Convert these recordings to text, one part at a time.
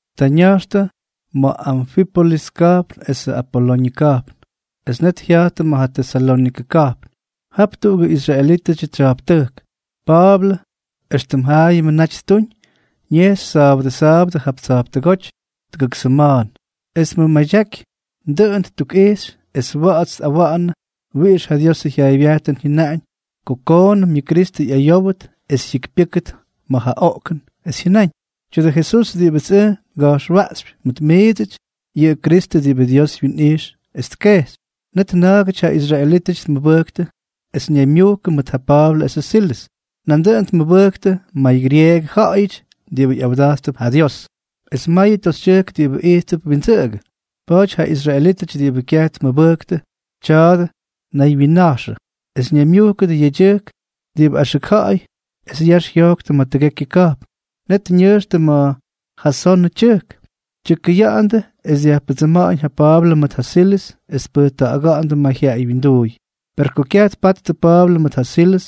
Ta ña̱jxtʉ ma̱ Anfípolis ka̱jpn esʉ Apoloñʉ ka̱jpn, es net jya̱jttʉ ma̱ Tesalónikʉ ka̱jpn. Jap tuꞌugʉ israelítʉdyʉ tsya̱jptʉjk. Pa̱a̱blʉ, éxtʉm jaayʉmʉ naty ttuñ, ñejxy sa̱a̱bʉdʉ sa̱a̱bʉdʉ jap tsa̱jptʉgóty tʉgʉk sʉma̱a̱n, es tmʉmadyaꞌaky, dʉꞌʉn ttukꞌixy es wa̱ꞌa̱ts tꞌawa̱ꞌa̱nʉ wiꞌix ja Diosʉ jyaaybyajtʉn jyʉnaꞌañ ko koonʉm yʉ Kristʉ ꞌyayówʉt es jyikypyʉ́kʉt ma̱ ja oꞌkʉn, es jyʉnáñ: —Tya̱dʉ Jesús diꞌibʉts ʉj nga̱jxwaꞌxypy mʉt miidsʉty, yʉꞌʉ Kristʉ diꞌibʉ Dios wyinꞌijx es tkejxy. Net na̱a̱gʉty ja israelítʉty tmʉbʉjktʉ es ñaymyujkʉ mʉt ja Pa̱a̱blʉ esʉ Silʉs. Nandʉꞌʉn tmʉbʉjktʉ maygyrieegʉ ja̱ꞌa̱yʉty diꞌibʉ ꞌyawda̱jttʉp ja Dios, es mayʉ toxytyʉjk diꞌibʉ ijttʉp windsʉꞌʉgʉ. Pa̱a̱ty ja israelítʉty diꞌibʉ kyaj tmʉbʉjktʉ tja̱ꞌa̱dʉ naywyinnaxʉ, es ñaymyujkʉdʉ yedyʉjk diꞌibʉ axʉk ja̱ꞌa̱y es yax jyojktʉ ma̱ tʉgekyʉ ka̱jpn. Net ñʉjxtʉ ma̱ Jasonʉ tyʉjk, tyʉkʉya̱ꞌa̱ndʉ es dyajpʉdsʉma̱ꞌa̱ñ ja Pa̱a̱blʉ mʉt ja Silʉs, es tpʉjta̱ꞌa̱ga̱ꞌa̱ndʉ mayjyaꞌay winduuy. Per ko kyaj tpattʉ Pa̱a̱blʉ mʉt ja Silʉs,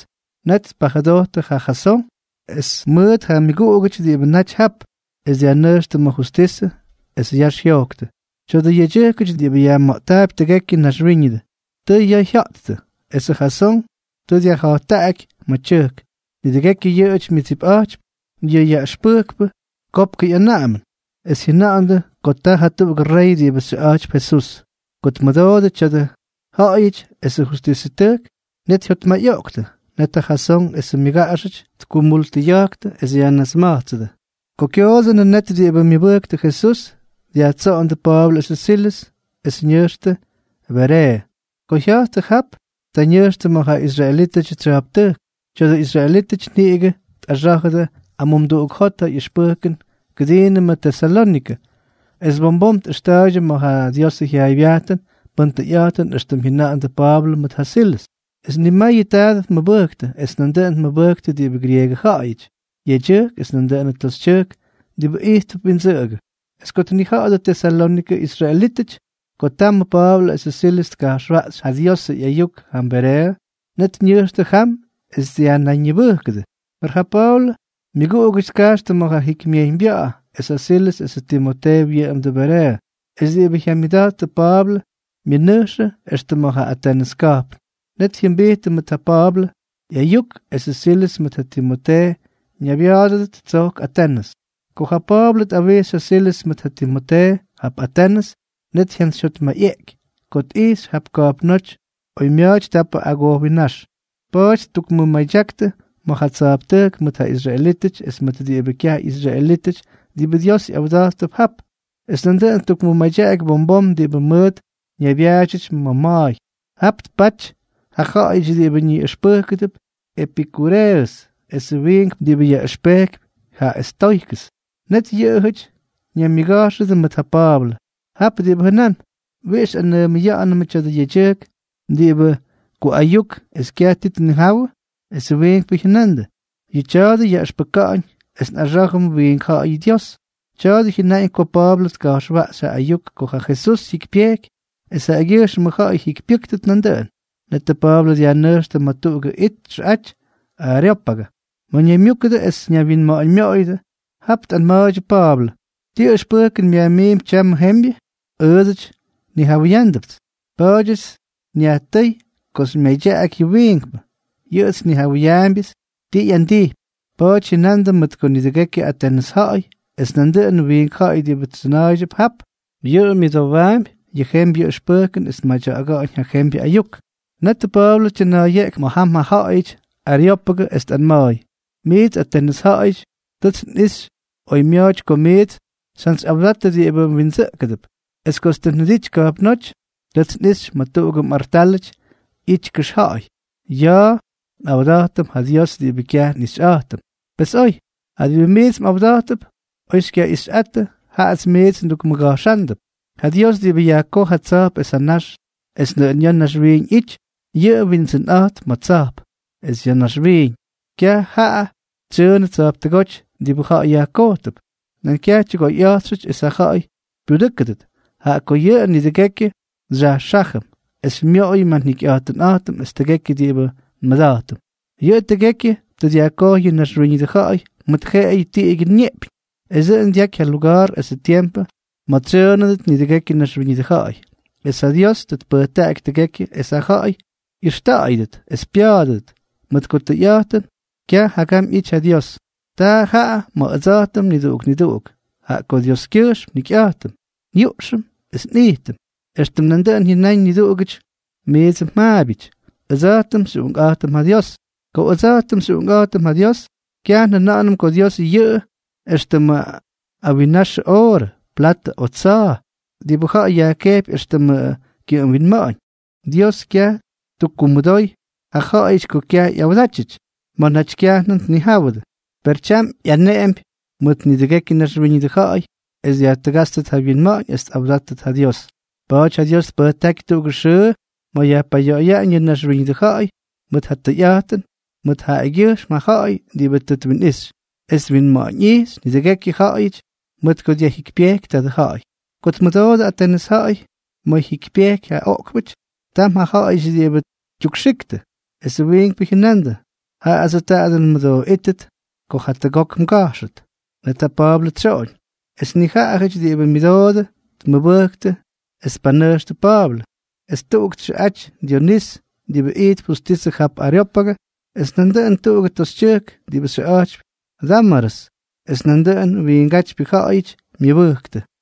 net tpajʉdojttʉ ja Jasón es mʉt ja myʉguꞌugʉty diꞌibʉ naty jap, es dyajnʉjxtʉ ma̱ justisʉ, es yax jyojktʉ: —Tya̱dʉ yedyʉjkʉty diꞌibʉ yajma̱ꞌttaapy tʉgekyʉ naxwíñʉdʉ, tʉ ya̱a̱ jya̱ꞌttʉ, esʉ Jasón tʉ dyajja̱jttaꞌaky ma̱ tyʉjk. Nidʉgekyʉ yʉꞌʉjʉty myʉdsipꞌa̱jtypy ja yajkutujkpʉ kopkʉ ꞌyanaꞌamʉn, es jyʉna̱ꞌa̱ndʉ ko ta jatuꞌugʉ rey diꞌibʉ xyʉꞌa̱jtypy Jesús. Ko tmʉdoodʉ tya̱a̱dʉ ja ja̱ꞌa̱yʉty esʉ justisʉtʉjk, net jyotmayꞌoꞌktʉ. Net ja Jasón esʉ myʉguꞌugʉty tkumultʉya̱jktʉ, es yajnasma̱jtsʉdʉ. Ko kyoodsʉnʉ, net diꞌibʉ myʉbʉjktʉ Jesús dyajtsoꞌondʉ Pa̱a̱blʉ esʉ Silʉs, es ñʉjxtʉ Bereeʉ. Ko jya̱jttʉ jap, ta ñʉjxtʉ ma̱ ja israelítʉdyʉ tsya̱jptʉjk. Tya̱dʉ israelítʉty niꞌigʉ tꞌaxá̱jʉdʉ amumduꞌuk jot ja ꞌyʉxpʉjkʉn kʉdiinʉmʉ Tesalónikʉ, es bom bom tꞌʉxta̱a̱ydyʉ ma̱ ja Diosʉ jyaaybyajtʉn pʉn tʉyꞌa̱jtʉn éxtʉmʉ jyʉna̱ꞌa̱ndʉ Pa̱a̱blʉ mʉt ja Silʉs. Es nimayʉ taadʉ tmʉbʉjktʉ, es nandʉꞌʉn tmʉbʉjktʉ diꞌibʉ grieegʉ ja̱ꞌa̱yʉty, yedyʉjk es nandʉꞌʉn toxytyʉjk diꞌibʉ ijttʉp windsʉꞌʉgʉ. Es ko tnija̱ꞌa̱dʉ Tesalónikʉ israelítʉty ko tamʉ Pa̱a̱blʉ esʉ Silʉs tka̱jxwaꞌxy ja Diosʉ ꞌyayuk jam Bereeʉ, net ñʉjxtʉ jam es dyajnayñibʉꞌkʉdʉ. Per ja Pa̱a̱blʉ myʉguꞌugʉty tkajxtʉ ma̱ ja jikymyejyñbya̱ꞌa̱, es ja Silʉs esʉ Timotee wyʉꞌʉmdʉ Bereeʉ. Es diꞌibʉ jyamyʉda̱jttʉ Pa̱a̱blʉ myʉnʉjxʉ extʉ ma̱ ja Atenʉs ka̱jpn. Net jyʉmbijttʉ mʉt ja Pa̱a̱blʉ ꞌyayuk esʉ Silʉs mʉt ja Timotee ñaybya̱a̱dʉdʉt tsojk Atenʉs. Ko ja Pa̱a̱blʉ tꞌawixy ja Silʉs mʉt ja Timotee jap Atenʉs, net jyantsyjyotmayꞌeꞌky ko tꞌijxy jap ka̱jpnóty oymya̱a̱ty tapʉ agojwinnáx. Pa̱a̱ty ttukmʉmadyaktʉ ma̱ ja tsa̱jptʉjk mʉt ja israelítʉty es mʉt diꞌibʉ kyaj ꞌyisraelítʉty diꞌibʉ Dios ꞌyawda̱jttʉp jap, es nandʉꞌʉn ttukmʉmadyaky bom bom diꞌibʉ mʉt ñaybyaadyʉty ma̱ ma̱a̱y. Jap tpaty ja ja̱ꞌa̱yʉty diꞌibʉ ñiꞌʉxpʉjkʉp epikuureʉs esʉ wiinkpʉ diꞌibʉ ꞌyʉxpejkypy ja estoykʉs. Net yʉꞌʉjʉty ñaymyʉga̱jxʉdʉ mʉt ja Pa̱a̱blʉ. Tap diꞌibʉ jʉnán: —¿Wiꞌix xyꞌanʉʉmʉya̱ꞌa̱nʉmʉ tya̱dʉ yedyʉjk diꞌibʉ kuꞌayuk es kyaj ti tnijawʉ? Esʉ wiinkpʉ jyʉnandʉ: —Yʉ tya̱a̱dʉ yaꞌʉxpʉka̱ꞌa̱ñ es nꞌaxá̱jʉm wiink ja̱ꞌa̱yʉ dyios. Tya̱a̱dʉ jyʉnáñ ko Pa̱a̱blʉ tka̱jxwaꞌxy ja ayuk ko ja Jesús jyikypyejky es jaꞌagyʉjxmʉ ja̱ꞌa̱y jyikypyʉ́ktʉt nandʉꞌʉn. Netʉ Pa̱a̱blʉ dyajnʉjxtʉ ma̱ tuꞌugʉ it txʉꞌaty Areópagʉ, ma̱ ñaymyúkʉdʉ es ñaywyinma̱ꞌa̱ñmyoꞌoyʉdʉ. Jap tꞌanma̱a̱ydyʉ Pa̱a̱blʉ: —¿Ti ʉxpʉjkʉn myajmiimpy tyamʉ jembyʉ? Ʉʉdsʉty nnijawʉyándʉpts. Pa̱a̱dyʉts nyajtʉ́y ko xymyadyaꞌaky yʉ wiinkpʉ. Yʉꞌʉts nnijawʉyaambyʉts ti ꞌyandijpy. Pa̱a̱ty jyʉnandʉ mʉt ko nidʉgekyʉ Atenʉs ja̱ꞌa̱y es nandʉꞌʉnʉ wiink ja̱ꞌa̱y diꞌibʉ tsʉna̱a̱y jap, yʉꞌʉ myʉdowaampy ja jembyʉ ʉxpʉjkʉn es tmadya̱ꞌa̱ga̱ꞌa̱ñ ja jembyʉ ayuk. Netʉ Pa̱a̱blʉ tyʉna̱a̱yeꞌky ma̱ jam ja ja̱ꞌa̱yʉty Areópagʉ, es tꞌanma̱a̱y: —Miits Atenʉs ja̱ꞌa̱yʉty, tʉts nꞌixy oymya̱a̱ty ko miits xyjantsyꞌawdattʉ diꞌibʉ mwindsʉꞌkʉdʉp. Es kots tʉ njʉdity ka̱jpnóty, tʉts nꞌixy ma̱ tuꞌugʉ mꞌartálʉty ꞌyity kʉxja̱ꞌa̱y: “Ya̱a̱ nꞌawda̱jtʉm ja Dios diꞌibʉ kyaj nꞌixyꞌa̱jtʉm.” Pes oy. Ja diꞌibʉ miits mꞌawda̱jttʉp, oy xykyaꞌixꞌattʉ, jaꞌats miits ndukmʉga̱jxándʉp. ’Ja Dios diꞌibʉ yajkoj ja tsa̱jp esʉ nax es nʉꞌʉn ya̱ naxwiiñ ꞌyity, yʉꞌʉ windsʉnꞌa̱jtp ma̱ tsa̱jp es naxwiiñ. Kyaj jaꞌa tsyʉʉnʉ tsa̱jptʉgóty diꞌibʉ ja̱ꞌa̱y kyojtʉp, nan kyaj tyʉgoyꞌa̱jtxʉty es ja ja̱ꞌa̱y pyudʉ́kʉdʉt, jaꞌa ko yʉꞌʉ nidʉgekyʉ xyajxájʉm, es xymyoꞌoyʉm ja njikyꞌa̱jtʉnꞌa̱jtʉm es tʉgekyʉ diꞌibʉ nmʉda̱jtʉm. ’Yʉꞌʉ tʉgekyʉ tʉ dyajkojy ja naxwíñʉdʉ ja̱ꞌa̱y mʉt jeꞌeyʉ tiꞌigyʉ neꞌpyñ, es tʉ dyaky ja luga̱a̱r esʉ tiempʉ ma̱ tsyʉʉnʉdʉt nidʉgekyʉ naxwíñʉdʉ ja̱ꞌa̱y. Es ja Dios tʉ tpʉjtaꞌaky tʉgekyʉ es ja ja̱ꞌa̱y ꞌyʉxta̱ꞌa̱yʉdʉt es pya̱a̱dʉdʉt, mʉt ko tʉyꞌa̱jtʉn kyaj jagam ꞌyity ja Dios. Taa jaꞌa ma̱ ʉdsa̱jtʉm niduꞌuk niduꞌuk. Jaꞌa ko Dioskyʉjxm njikyꞌa̱jtʉm, nyuꞌxʉm es nꞌijtʉm. Extʉm nandʉꞌʉn jyʉnáñ niduꞌugʉty miidsʉ mjaabyʉty: “Ʉdsa̱jtʉm xyꞌuꞌunkꞌa̱jtʉm ja Dios.” ’Ko ʉdsa̱jtʉm xyꞌuꞌunkꞌa̱jtʉm ja Dios, kyaj njʉna̱ꞌa̱nʉm ko Dios yʉꞌʉ éxtʉmʉ awinnaxʉ oorʉ, platʉ o tsa̱a̱, diꞌibʉ ja̱ꞌa̱y kyejpy éxtʉmʉ kyʉꞌʉm winma̱ꞌa̱ñ. Dios kyaj ttukkumʉdooy yʉ ja̱ꞌa̱yʉty ko kyaj ꞌyawdátyʉty ma̱ naty kyajnʉm tnijáwʉdʉ. Per tyam ꞌyaneꞌempy mʉt nidʉgekyʉ naxwíñʉdʉ ja̱ꞌa̱y es dyajtʉgátstʉt ja wyinma̱ꞌa̱ñ es tꞌawdátʉt ja Dios. Pa̱a̱ty ja Dios tpʉjtáky tuꞌugʉ xʉʉ ma̱ tpayoꞌoyaꞌañ yʉ naxwíñʉdʉ ja̱ꞌa̱y mʉt ja tʉyꞌa̱jtʉn mʉt jaꞌagyʉjxm ja ja̱ꞌa̱y diꞌibʉ tʉ twinꞌixy; es twinma̱ꞌa̱ñꞌijxy nidʉgekyʉ ja̱ꞌa̱yʉty mʉt ko dyajjikypyejky tadʉ ja̱ꞌa̱y. Ko tmʉdoodʉ Atenʉs ja̱ꞌa̱y ma̱ jyikypyejky ja oꞌkpʉty, tam ja ja̱ꞌa̱yʉty diꞌibʉ tyukxiktʉ, esʉ wiinkpʉ jyʉnandʉ: —Jaadsʉ tadʉ nmʉdooꞌíttʉt ko jatʉgok mga̱jxʉt. Net ja Pa̱a̱blʉ tsyoꞌoñ. Es nijaꞌajʉty diꞌibʉ myʉdoodʉ tmʉbʉjktʉ es tpanʉjxtʉ Pa̱a̱blʉ. Es tuꞌuk txʉꞌaty Dyonís, diꞌibʉ ijtp justisʉ jap Areópagʉ, es nandʉꞌʉn tuꞌugʉ toxytyʉjk diꞌibʉ xyʉꞌa̱jtypy Dámarʉs, es nandʉꞌʉnʉ wiingátypyʉ ja̱ꞌa̱yʉty myʉbʉjktʉ.